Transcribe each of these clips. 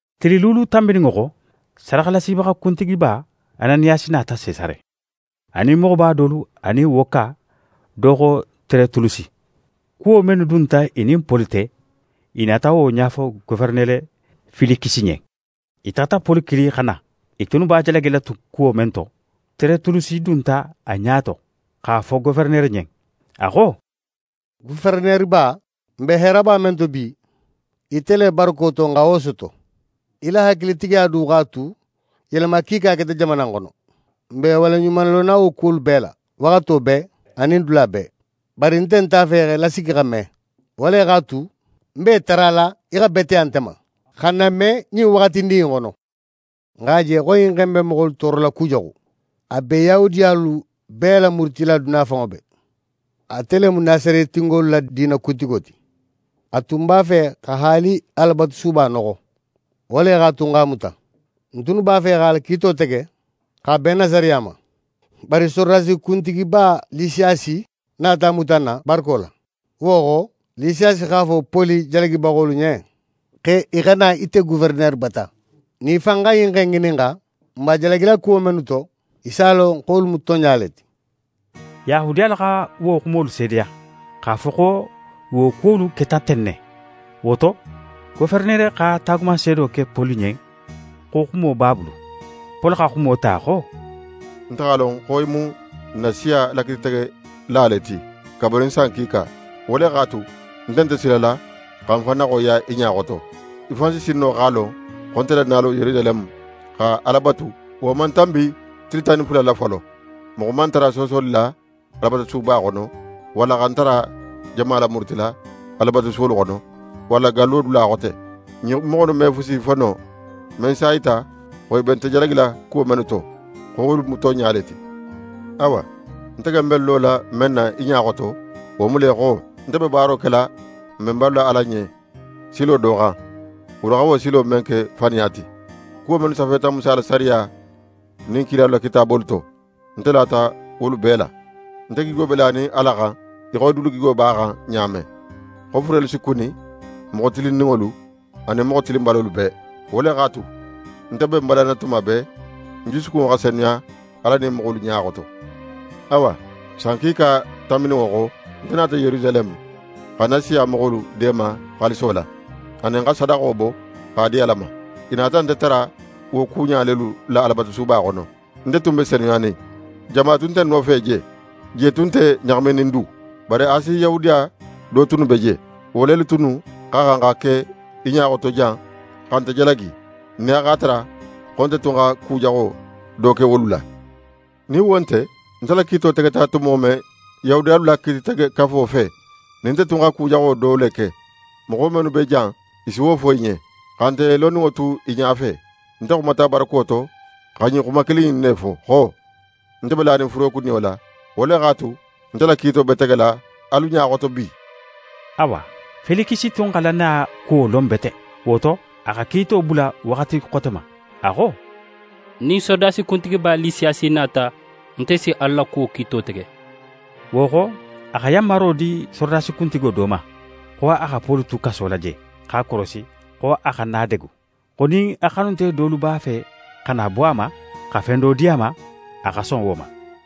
Tili luulu tanbininŋo xo, sadaxalasibaxa kuntigiba Ananiyasi nata Sesare, a nin moxoba dolu anin woka do xo Teretulusi. Kuwo mennu dunta i nin Poli te, i nata wo ɲafo Goferenere Felikisi ɲen. I taxata Poli kili xa na. I tunnu b'a jalagila kuwo men to, Teretulusi dunta a ɲa to x'a fo goferenere ɲen. A xo: «Goferenereba, n be heeraba men to bi, ite le barako to n xa wo soto. Í la hakilitigiya du x'a tu yelema kiika keta jamana in xono. N be í waleɲumalonna wo kuwolu bee la, waxato bee anin dula bee. Bari nte nt'a fe x'e lasigi xa me. Wo le x'a tu, ń be í tarala í xa beteya nte ma, xa n name ɲin waxatindin in xono. N x'a je xo ɲin xe in be moxolu toorola kujaxu. A be Yahudiyalu bee lamurutila duniya fanŋo bee. Ate le mu Nasaretingolu la diina kuntigo ti. A tun b'a fe xa haali Alabatusuba noxo. Wo le x'a tu, n x'a muta. [N tunnu b'a fe x'a la kiito tege x'a ben n na sariya ma. Bari sorodasi kuntigiba Lisiyasi nata a muta n na, barako la. Wo xo, Lisiyasi x'a fo Poli jalagibaxolu ɲen, xo i xa na ite Goferenere bata.] Nin í fan xa ɲin xe in ŋininxa, n b'a jalagila kuwo mennu to, í s'a lon xo wolu mu tonɲa le ti.» Yahudiyalu xa wo xumolu seedeya, x'a fo xo wo kuwolu keta ten ne. Wo to, goferenere xa taagumanseedo ke Poli ɲen xo xumo b'a bulu. Poli xa xumo ta xo: «Nte x'a lon xo í mu n na siya la kiititegela ti kabirin san kiika. Wo le x'a tu, nte nte silala xa ń fan naxoyiya í ɲa xoto. Í fan si sin no x'a lon, xo nte la nalo Yerusaleme xa Ala batu, wo man tanbi tili tan nin fula la folo. Moxo man ń tara soosoli la Alabatusuba xono, walla xa ń tara jama lamurutila Alabatusuwolu xono, walla gallo dula xote. Ɲin moxo innu me fusi fo no, men si a yita xo i be nte jalagila kuwo mennu to, xo wolu mu tonɲa le ti. Awa, nte ken be ń lola men na í ɲa xoto, wo mu le xo: Nte be baaro kela n benbalu la Ala le ɲen silo do xan, wolu xa silo men ke faniya ti. Kuwo mennu safeta Musa la sariya nin kilalu la kitaabolu to, nte lata wolu bee la. Nte gigo be lanin Ala xan, í xo i dulu gigo b'a xan ɲa men, xo furelu si kuni, moxo tilinninŋolu anin moxo tilinbalolu bee. Wo le x'a tu, nte be ń balanna tuma bee, ń jusukunŋo xa senuya Ala anin moxolu ɲa xoto. «Awa, san kiika tanbininŋo xo, nte nata Yerusaleme, xa ń na siya moxolu deema xaaliso la, anin xa sadaxo bo x'a di Ala ma. I nata nte tara wo kuɲa lelu la Alabatusuba xono. Nte tun be senuyanin. Jama tun nte ń nofe je, je tun nte ɲaxaminin du. Bari Asi Yahudiya do tunnu be je. Wo lelu tunnu xa xan xa ke í ɲa xoto jan xa nte jalagi, nin a x'a tara xo nte tun xa ku jaxo do ke wolu la. Nin wo nte, nte la kiito tegeta tumo men Yahudiyalu la Kiititegekafo fe, nin nte xa ku jaxo do le ke, moxo mennu be jan, i si wo fo í ɲen. Xa nte loninŋo tu i ɲafe, nte xumata barako to xa ɲin xuma kilin in ne fo xo: “Nte be lanin furekuniyo la, wo le x'a tu nte la kiito be tegela alu ɲa xoto bi!”» Awa, Felikisi tun xa lannaya kuwo lon bete, wo to, a xa kiito bula waxati xote ma. A xo: «Nin sorodasi kuntigiba Lisiyasi nata, nte si alu la kuwo kiito tege.» Wo xo, a xa yanmaro di sorodasi kuntigo do ma, xo a xa Poli tu kaso la je, x'a korosi, xo a xana a degu, xo nin a xanunte dolu b'a fe xa na bo a ma, xa fen do di a ma, a xa son wo ma.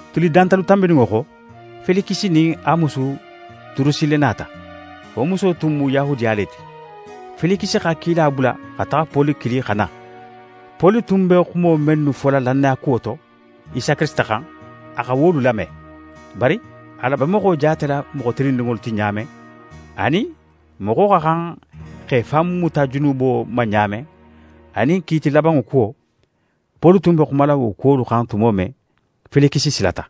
Tili dantalu tanbininŋo xo, Felikisi nin a musu Durusile nata. Wo muso tun mu Yahudiya le ti. Felikisi xa kila bula xa taxa Poli kili xa na. Poli tun be xumo mennu fola lannaya kuwo to, Isa Kirisita xan, a xa wolu lame. Bari Ala be moxo jaatela moxo tilinninŋo ti ɲa men, anin moxo xa xan x'é fan muta junubo ma ɲa men, anin kiiti labanŋo kuwo, Poli tun be xumala wo kuwolu xan tumo men, Felikisi silata.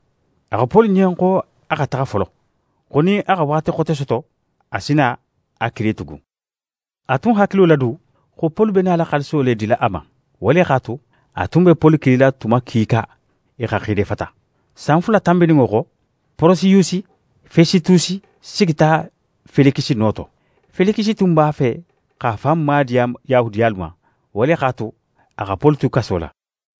A xo Poli ɲen xo a xa taxa folo; xo nin a xa waxati xote soto, a si na a kili tugun. A tun hakilo la du, xo Poli be nala xaaliso le dila a ma. Wo le x'a tu, a tun be Poli kilila tuma kiika i xa xiidefata. San fula tanbininŋo xo, Porosiyusi Fesitusi sigita Felikisi no to. Felikisi tun b'a fe x'a fan maadiya Yahudiyalu ma, wo le x'a tu, a xa Poli tu kaso la.